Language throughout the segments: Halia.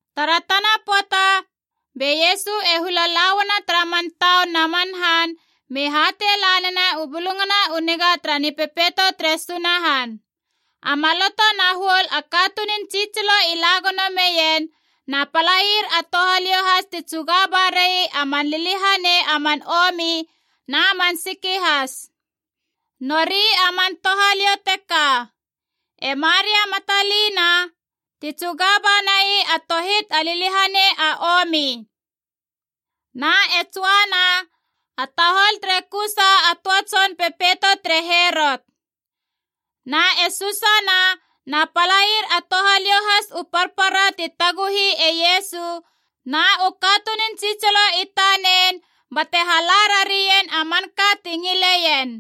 Tara tana pöata be Iesu e hula lauana tara man taun na man han, me hatei la nena u Bulungana u Niga tara Nipepeito tere Sunahan. A maloto na huol a katunun tsitsilo i la gono meien, na palair a touhaliou has ti tsuga barai a man liliahanei a man omi na man siki has. Nori a man touhaliou teka: e Maria Matalina, ti tsuga banai a tohit a liliahanei a omi. Na e Joana, a tahol tere Kusa a töa tson pepeito tere Herot. Na e Susana, na palair a touhaliou has u parpara ti taguhi e Iesu na u katunun tsitsilo i tanen bate hala rarien a manka ti ngileien.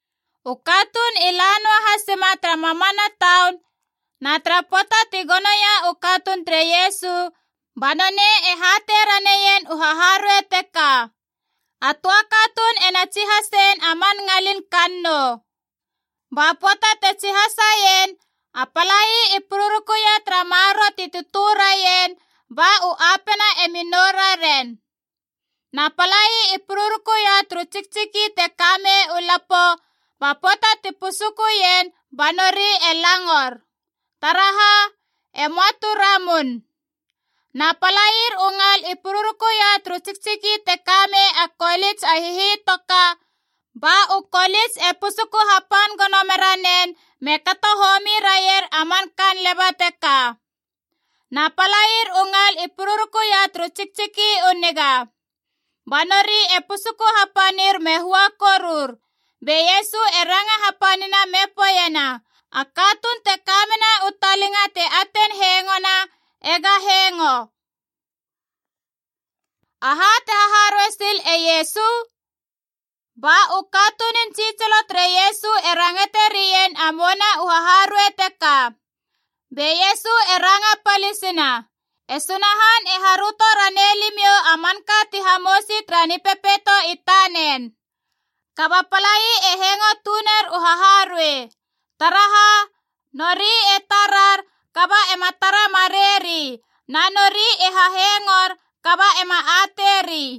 U katuun i la noa hasima tara mamana taun, na tara pöata ti gonoia u katuun tere Iesu, ba nonei e hatei raneien u haharuei teka: “A töa katuun ena tsihasein a man ngalina kannou. Ba pöata te tsihasaien, a palai i pururukuia tara maroro ti tötö raien, ba u apena emi nou raren. Na palai i pururukuia turu tsiktsiki te ka mei u lapo, ba pöata ti pusukuien ba nori e langor. Taraha? E möa tu ramun. Na palair u ngal i pururukuia turu tsiktsiki te ka mei a kolits a hihitoka, ba u kolits e pusuku hapan gono mera nen me kato homi raier a man kaan leba teka. Na palair u ngal i pururukuia turu tsiktsiki u niga. Ba nori e pusuku hapanir me hua korur.” Be Iesu e ranga hapanina me poeiena, “A katuun te ka mena u talinga te atein hengona ega hengo!” Aha te haharuei sil e Iesu? Ba u katunun tsitsilo tere Iesu e rangate rien a mouna u haharuei teka. Be Iesu e ranga palisina, “E Sunahan e haröto ranei limiou a manka ti hamousi tara Nipepeito i tanen. Kaba palai e hengo tuner u haharuei. Taraha? Nori e tarar kaba ema tara mareieri, na nori e hahengor kaba ema ateiri.”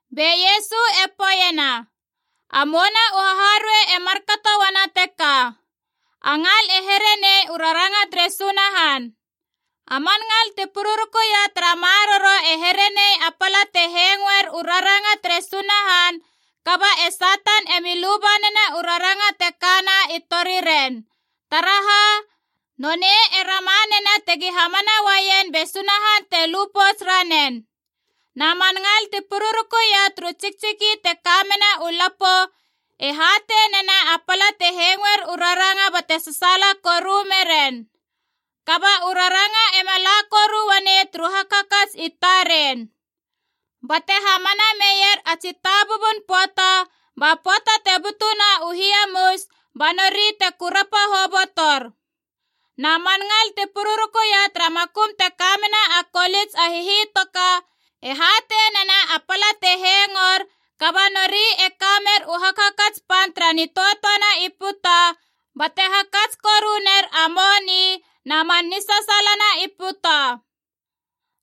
Be Iesu e poeiena, “A mouna u haharuei e markato uana teka: a ngal e here nei u raranga tere Sunahan. A man ngal ti pururukuia tara maroro e herenei a pala te hengoer u raranga tere Sunahan, kaba e Satan emi luba nena u raranga te kana i toriren. Taraha? Nonei e rama nena tegi hamana uaien be Sunahan te lu pouts ranen. Na man ngal ti pururukuia turu tsiktsiki te ka mena u lapo e hatei nena a pala te hengoer u raranga bate sasaala koru meren. Kaba u raranga ema la koru uanei turu hakhakats i taren. Bate hamana meier a tsitabubun pöata, ba pöata te butuna u hiamus, ba nori te kurapa hobotor. Na man ngal ti pururukuia tara makum te kamena a kolits a hihitoka e hatei nena a pala te hengor, kaba nori e ka mer u hakhakats pan tara nitöatöa na i puta, bate hakats koru ner a moni na man nisasaala na i puta.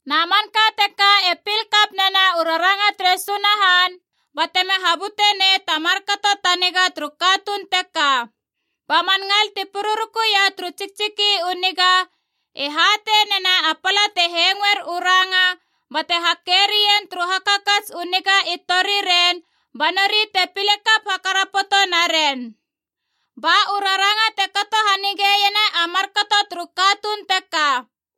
Na manka teka e pil kap nena u raranga tere Sunahan batema habute nei ta markato ta niga turu katuun teka. Ba man ngal ti pururukuia turu tsiktsiki u niga e hatei nena a pala te hengoer u ranga bate hake rien turu hakhakats u niga i toriren, ba nori te pile kap hakarapoto naren. Ba u raranga te kato hanigeiena a markato turu katuun teka.”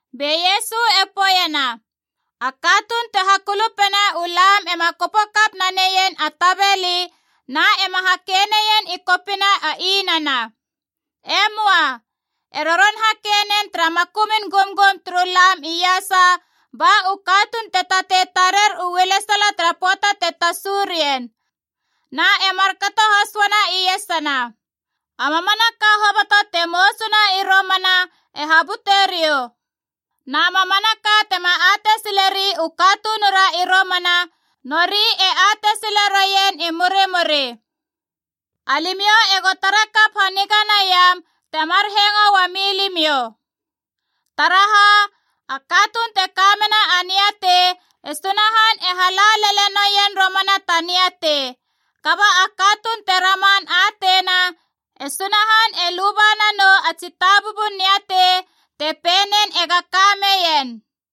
Be Iesu e poeiena, “A katuun te hakulupena u lam ema kopo kap naneien a tabeli na ema hake neien i kopina a inana. E möa, e roron hake nen tara makumun gumgum turu lam iasa ba u katuun te tatei tarer u ualesala tara pöata te tasu rien. Na e markato has uana iesana, a mamanaka hoboto te mousuna i romana e habuteriou. Na mamanaka tema atei sileri u katunura i romana, nori e atei sile roien i murimuri. Alimiou ego tara kap haniga naiam temar hengo uami limiou. Taraha? A katuun te ka mena a niatei, e Sunahan e hala lele noien romana ta niatei. Kaba a katuun te raman ateina, e Sunahan e luba nanou a tsitabubun niatei te pei nen ega ka meien.”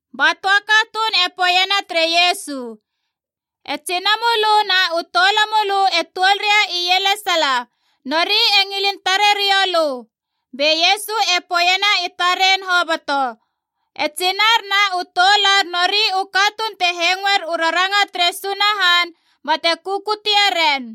Ba töa katuun e poeiena tere Iesu, “E tsinamölö na u toulamölö e tuol ria ielesala, nori e ngilin tare rioulö.” Be Iesu e poeiena i taren hoboto, “E tsinar na u toular nori u katuun te hengoer u raranga tere Sunahan bate kukutie ren.”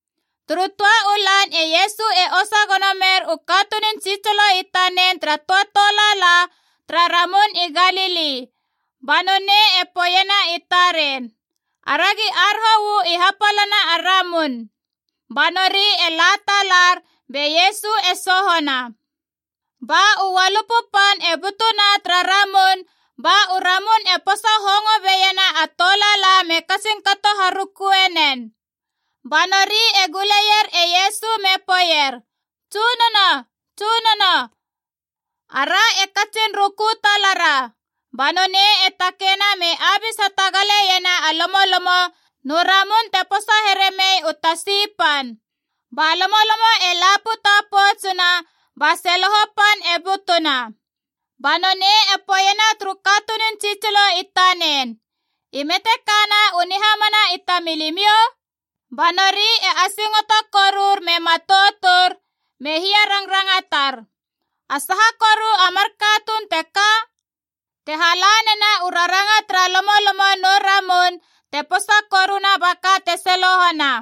Turu töa u lan e Iesu e osa gono mer u katunun tsitsilo i tanen tara töa tolaala tara Ramun i Galili, ba nonei e poeiena i taren, “Aragi aroho uu i hapalana a ramun.” Ba nori e la talar, be Iesu e sohona. Ba u ualupu pan e butuna tara ramun ba u ramun e posa hongo beiena a tolaala me katsin kato harukue nen. Ba nori e guleier e Iesu me poeier, “Tsunono, Tsunono! Ara e katsin ruku talara!” Ba nonei e takeina me abis hatagaleiena a lomolomo nu ramun te posa here mei u tasi pan. Ba lomolomo e la puta poutsuna ba seloho pan e butuna. Ba nonei e poeiena turu katunun tsitsilo i tanen, “I me te kana u nihamana i tamilimiou?” Ba nori e asingoto korur me matoutur, me hiarangrangatar, “A saha koru a mar katuun teka? Te hala nena u raranga tara lomolomo nu ramun te posa koruna ba ka te selohona!”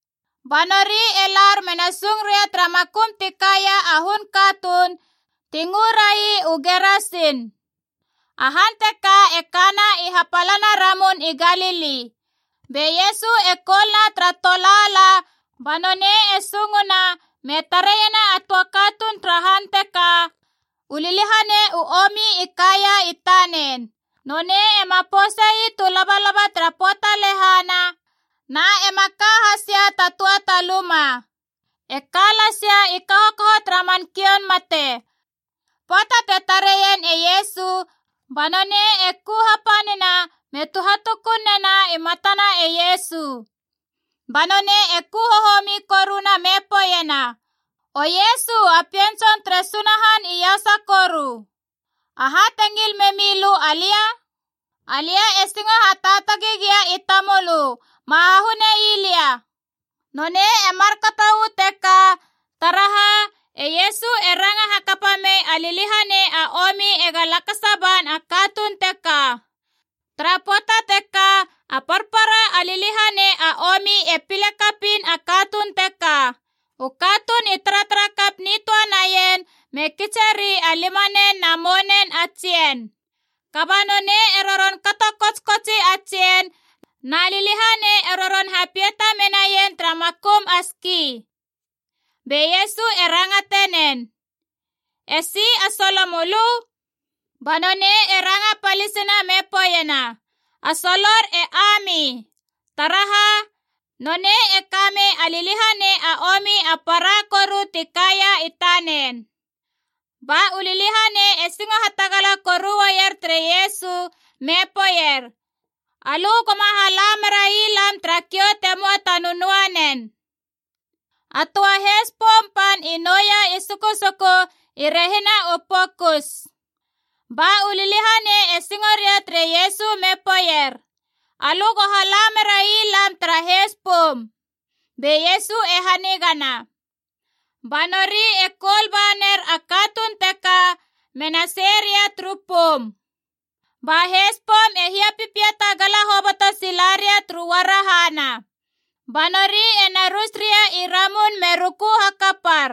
Ba nori e lar mena sung ria tara makum ti kaia a hun katuun ti ngörai u Gerasin. A han teka e kana i hapalana a Ramun i Galili. Be Iesu e koul na tara tolaala ba nonei e sunguna me tareiena a töa katuun tara han teka, u liliahanei u omi i kaia i tanen. Nonei ema pousei tu labalaba tara pöata lehana, na ema ka hasia ta töa ta luma. E ka lasia i kahokaho tara man kioun mate. Pöata te tareien e Iesu, ba nonei e ku hapanina me tuhatukun nena i matana e Iesu. Ba nonei e ku hohomi koruna me poeiena, “O Iesu a Pien Tson tere Sunahan Iasa Koru! Aha te ngil memi lö alia? Alia e singo hataatagi gia i tamölö, ma hahunei lia!” Nonei e markato uu teka, taraha, e Iesu e ranga hakapa mei a liliahanei a omi ega lakasa ban a katuun teka. (Tara pöata teka a parpara a liliahanei a omi e pile kapiin a katuun teka. U katuun i taratara kap nitöa naien me kitseri a limanen na mounen a tsien. Kaba nonei e roron kato kotskotsi a tsien, na liliahanei e roron hapiata menaien tara makum a ski.) Be Iesu e rangate nen, “Esi a solomölö?” Ba nonei e ranga palisina me poeiena, “A solor e Ami!” Taraha? Nonei e kamei a liliahanei a omi a para koru ti kaia i tanen. Ba u liliahanei e singo hatagala koru uaier tere Iesu me poeier, “Alö go ma hala merai lam tara kiou te möa ta nönöanen!” A töa heis poum pan i nouia i sukusuku i rehina u pokus. Ba u liliahanei e singo ria tere Iesu me poeier, “Alö go hala merai lam tara heis poum!” Be Iesu e hanigana. Ba nori e koul ba ner a katuun teka me na sei ria turu poum. Ba heis poum e hiapipiata gala hoboto sila ria turu uarahana. Ba nori e na rus ria i ramun me ruku hakapar.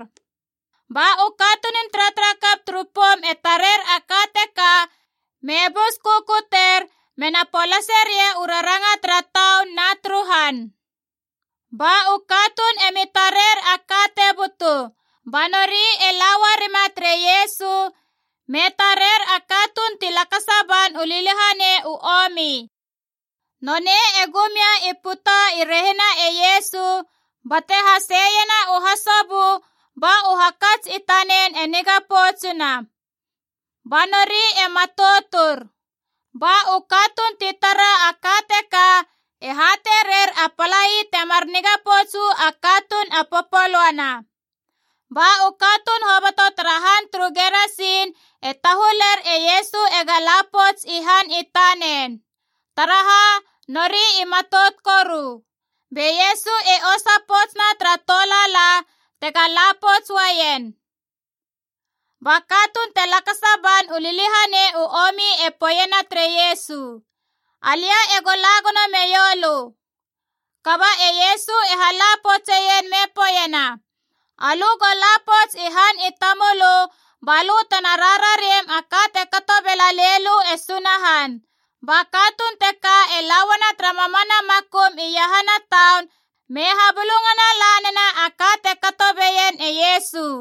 Ba u katunun taratara kap turu poum e tarer a ka teka me bus kukuter, me na polaseria u raranga tara taun na turu han. Ba u katuun e mi tarer a ka te butu. Ba nori e la uarima tere Iesu me tarer a katuun ti lakasa ban u liliahanei u omi. Nonei e gum ia i puta i rehina e Iesu bate haseiena u hasobö, ba u hakats i tanen e niga poutsuna. Ba nori e matoutur. Ba u katuun ti tara a ka teka e hatei rer a palai temar niga pouts uu a katuun a popolöana. Ba u katuun hoboto tara han turu Gerasin e tahuler e Iesu ega la pouts i han i tanen. Taraha? Nori i matout koru. Be Iesu e osa poutsina tara tolaala, tega la pouts uaien. Ba katuun ti lakasa ban u liliahanei u omi e poeiena tere Iesu, “Alia e go la gono meiou lö.” Kaba e Iesu e hala poutseien me poeiena, “Alö go la pouts i han i tamölö ba lö tena rarariem a ka te kato bela lei lö e Sunahan.” Ba katuun teka e la uana tara mamana makum iahana taun me habulungana la nena a ka te kato beien e Iesu.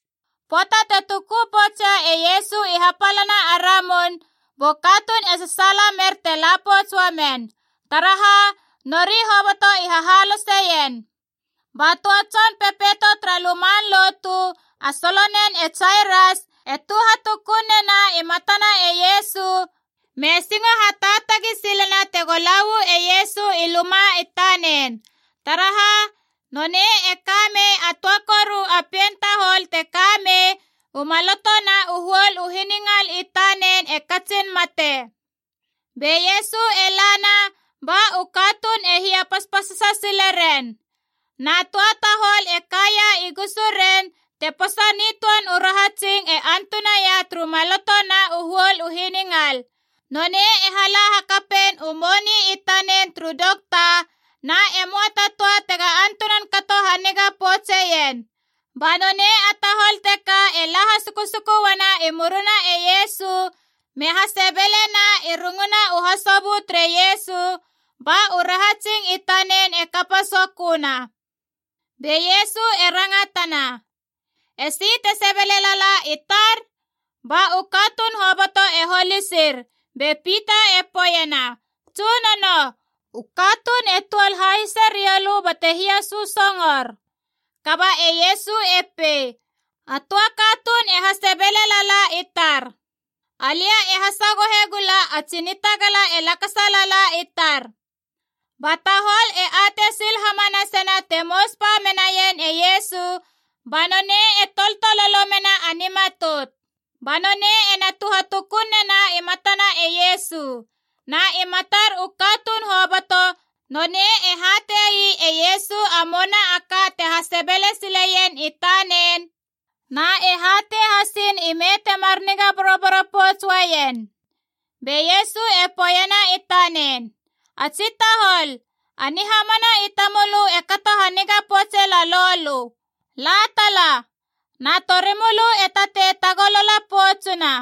Pöata te tuku poutsia e Iesu i hapalana a ramun, bu katuun e sasaala mer te la pouts uamen. Taraha? Nori hoboto i hahaloseien. Ba töa tson pepeito tara luman lotu, a solonen e Jairas, e tuhatukun nena i matana e Iesu me singo hataatagi silena tega la uu e Iesu i luma i tanen. Taraha? Nonei e ka mei a töa koru a pien tahol te ka mei u maloto na u huol u hiningal i tanen e katsin mate. Be Iesu e lana ba u katuun e hiapaspasasa sile ren. Na töa tahol e kaia i gusuren te posa nitöan u rahatsing e antunaia turu maloto na u huol u hiningal. Nonei e hala hakapein u moni i tanen turu dokta, na e möa ta töa tega antunan kato haniga poutseien. Ba nonei a tahol teka e la hasukusuku uana i murina e Iesu me hasebelena i runguna u hasobö tere Iesu, ba u rahatsing i tanen e kapa soköna. Be Iesu e rangatana, “Esi te sebele lala i tar?” Ba u katuun hoboto e holisir, be Pita e poeiena, “Tsunono, u katuun e tuol hahise rioulö bate hiasösongor!” Kaba e Iesu e pei, “A töa katuun e hasebele lala i tar. Alia e hasagohe gula a tsi nitagala e lakasa lala i tar!” Ba tahol e atei sil hamanasena te mous ba menaien e Iesu, ba nonei e toltololo mena a nimatout. Ba nonei ena tuhatukun nena i matana e Iesu. Na i matar u katuun hoboto, nonei e hatei e Iesu a mouna a ka te hasebele sileien i tanen, na e hatei hasin ime temar niga boroboro pouts uaien. Be Iesu e poeiena i tanen, “A tsi tahol, a nihamana i tamölö e kato haniga poutse lalou lö. La tala, na torimölö e tatei tagolala poutsuna.”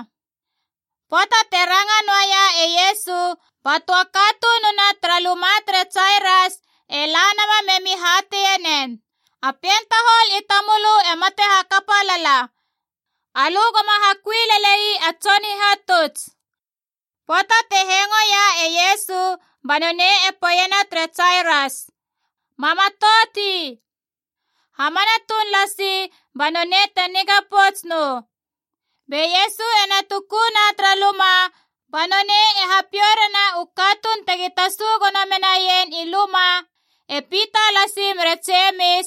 Pöata te ranga noaia e Iesu, ba töa katununa tara luma tere Jairas e la nama me mi hateie nen, “A pien tahol i tamölö e mate hakapa lala. Alö goma hakui lelei a Tson Hihatuts.” Pöata te hengoia e Iesu, ba nonei e poeiena tere Jairas, “Ma matouti. Hamana tuun lasi, ba nonei te niga pouts nou.” Be Iesu e na tukuna tara luma ba nonei e hapiou rena u katuun tegi tasu gono menaien i luma, e Pita lasi mere Jemis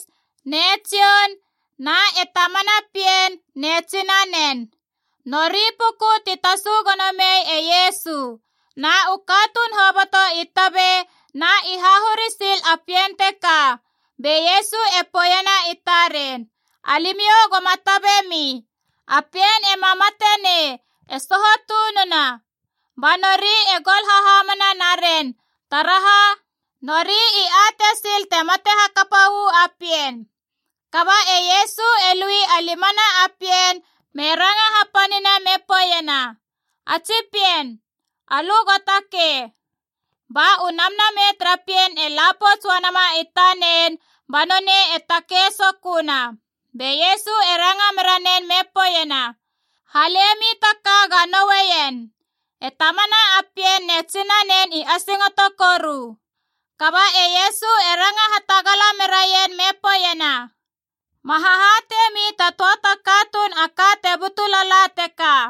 ne Jon na e tamana pien ne tsinanen. Nori puku ti tasu gono mei e Iesu. Na u katuun hoboto i tabe na i hahuri sil a pien teka. Be Iesu e poeiena i taren, “Alimiou goma tabe mi. A pien ema mate nei, e soho tununa.” Ba nori e gol hahamana naren. Taraha? Nori i atei sil te mate hakapa uu a pien. Kaba e Iesu e lui a limana a pien me ranga hapanina me poeiena, “A tsi pien, alö go takei!” Ba u namnamei tara pien e la pouts uanama i tanen, ba nonei e takei soköna. Be Iesu e ranga mera nen me poeiena, “Halemi ta ka ga noueien.” E tamana a pien ne tsinanen i asingoto koru. Kaba e Iesu e ranga hatagala meraien me poeiena, “Ma hahateiemi ta töa ta katuun a ka te butu lala teka.”